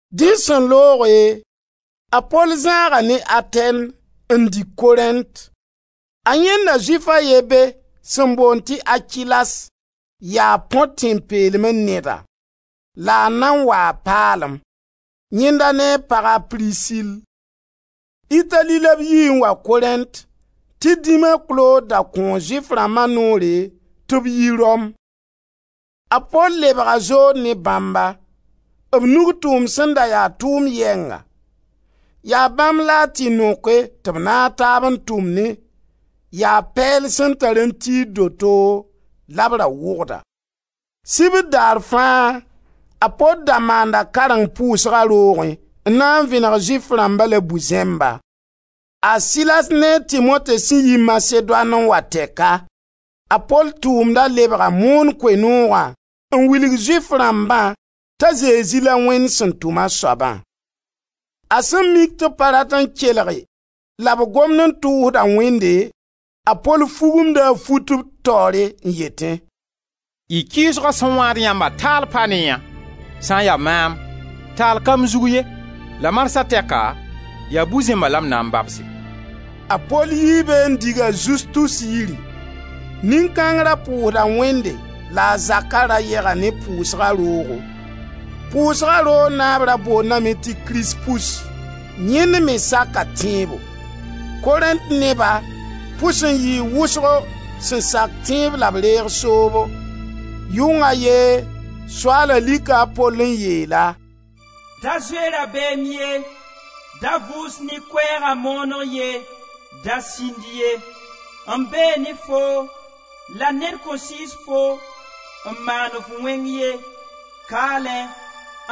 Dẽ sẽn looge, a Pol zãaga ne Atɛn n dig Korẽnt. A yãenda Zʋɩf a ye be sẽn boond tɩ Akilas, yaa Põ tẽn-peelmẽ neda la a nan waa paalem, yẽnda ne a pag a Prisil. Itali la b yii n wa Korẽnt tɩ dĩm a Klod da kõo Zʋɩf rãmba noore tɩ b yi Rom. A Pol lebga zood ne bãmba, b nug tʋʋmd sẽn da ya tʋʋm yɛnga. Yaa bãmb la a tɩ noke tɩ b naag taab n tʋmnẽ. Yaa pɛɛl sẽn tar n tiid doto la b ra wʋgda. Sibr daar fãa a Pol da maanda kareng pʋʋsga roogẽ n na n vẽneg Zʋɩf rãmba la bu-zẽmba. A Silas ne a Timote sẽn yi Masedoan n wa tɛka, a Pol tʋʋmda lebga moon Koe-noogã n wilg Zʋɩf rãmbã t'a Zezi la Wẽnd sẽn tʋm a soabã. A sẽn mik tɩ b pa rat n kelge la b gomd n tʋʋsda Wẽnde, a Pol fugumda a fut b taoore n yetẽ: «Y kɩɩsga sẽn wãad yãmba taal pa ne yã. Sã n ya maam, taal ka m zug ye la marsã tɛka yaa bu-zẽmba la m na n babse.» A Pol yii be n dig a Zustus yiri; nin-kãng ra pʋʋsda Wẽnde la a zaka ra yega ne pʋʋsga roogo. Pʋʋsga roog naab ra boondame tɩ Krispus. Yẽnd me saka tẽebo. Korẽnt neba pʋs n yɩɩ wʋsgo sẽn sak tẽeb la b reeg soobo. Yʋng a ye Soaala lika a Pol n yeel-a: «Da zoe rabeem ye, da vʋʋs ne Koɛɛga mooneg ye, da sĩnd ye. M bee ne foo la ned kõn sɩɩs-fo n maan-f wẽng ye, kaalẽ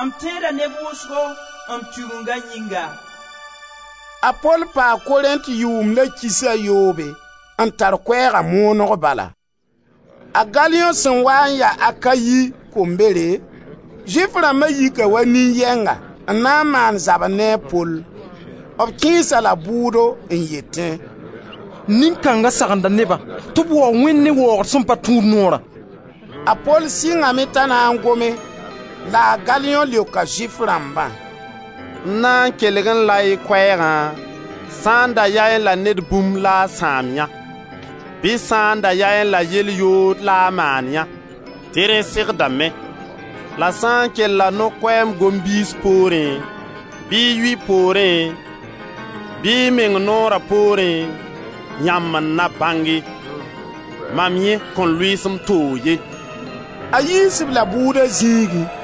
m tẽeda neb wʋsgo m Tigenga yĩnga.» A Pol paa Korẽnt yʋʋmd la kiis a yoobe, n tar Koɛɛga mooneg bala. A Galiõ sẽn waa n ya Akayi kombere, Zʋɩf rãmba yika wa nin-yɛnga n na n maan zabr ne a Pol. B kẽes-a la bʋʋdo, n yetẽ: «Nin-kãnga sagenda neba tɩ b waoog Wẽnd ne waoogr sẽn pa tũud Noorã.» A Pol sɩngame t'a na n gome la a Galiõ leoka Zʋɩf rãmbã: «M na n kelgẽ-la y koɛɛgã sã da yaẽ la ned bũmb la a sãam yã, bɩ sã n da yaẽ la yel-yood la a maanyã, tɩ rẽ segdame. La sã n kella no-koɛɛm goam biis poorẽ, bɩ yʋy poorẽ, bɩ y meng Noora poorẽ, yãmb n na bãnge, mam yẽ kõn lʋɩɩs m toog ye.» A Yiis-b-la bʋʋda zĩigẽ.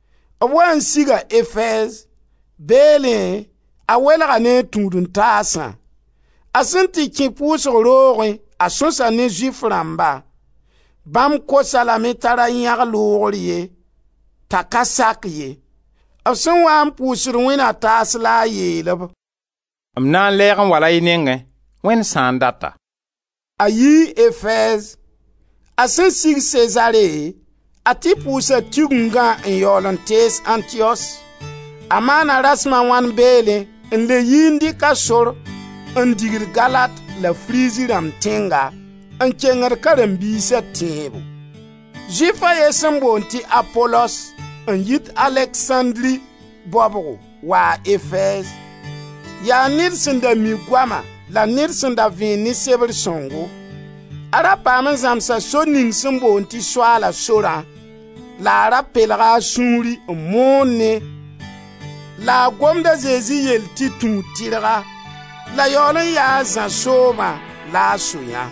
B waa n siga Efɛɛz. Beelẽ a welga ne a tũud-n-taasã. A sẽn tɩ kẽ pʋʋsg roogẽ a sõsa ne Zʋɩf rãmba. Bãmb kos-a lame t'a ra yãg loogr ye, t'a ka sak ye. B sẽn waa n pʋʋsd Wẽnd na taas la a yeel-b: «M na n lɛɛg n wala y nengẽ, Wẽnd sã n data.» A yii Efɛɛz. A Sẽn sig Sezare, a tɩ pʋʋsa Tigengã n yaool n tees Antiyos. A maana rasem a wãn beelẽ n le yi n dɩk a sor n digd Galat la Frizi rãmb tẽnga, n kengd karen-biisa tẽebo. Zʋɩf a ye sẽn boond tɩ Apolos, n yit Aleksãndri baobgo, waa Efɛɛz. Yaa ned sẽn da mi goama la ned sẽn da vẽen ne Sebr sõngo. A ra paam n zãmsa sor ning sẽn boond tɩ Soaala sorã la a ra pelga a sũuri n moonẽ la a gomd a Zezi yell tɩ tũud tɩrga, la yaool n ya a Zã soobã la a so yã.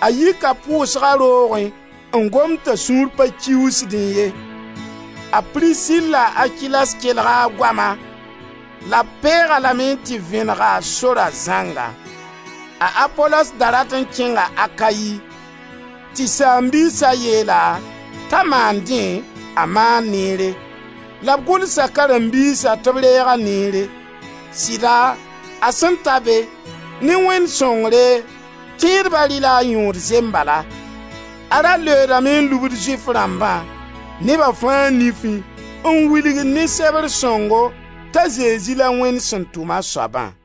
A yika pʋʋsga roogẽ n gomd t'a sũur pa kiuusdẽ ye. A Prisil la a Akilas kelga a goama la b peeg-a lame n tɩ vẽneg-a Sora zãnga. A Apolos da rat n kẽnga Akayi, tɩ saam-biisa yeel-a t'a maan dẽ, a maan neere, la b gʋlsa karen-biisa tɩ b reeg-a neere. Sɩda a sẽn ta be, ne Wẽnd sõngre, tẽedba rɩ-la a yõod zembala. A ra leoodame n lubd Zʋɩf rãmbã, neba fãa nifẽ, n wilgd ne Sebr sõngo t'a Zezi la Wẽnd sẽn tʋm a soabã.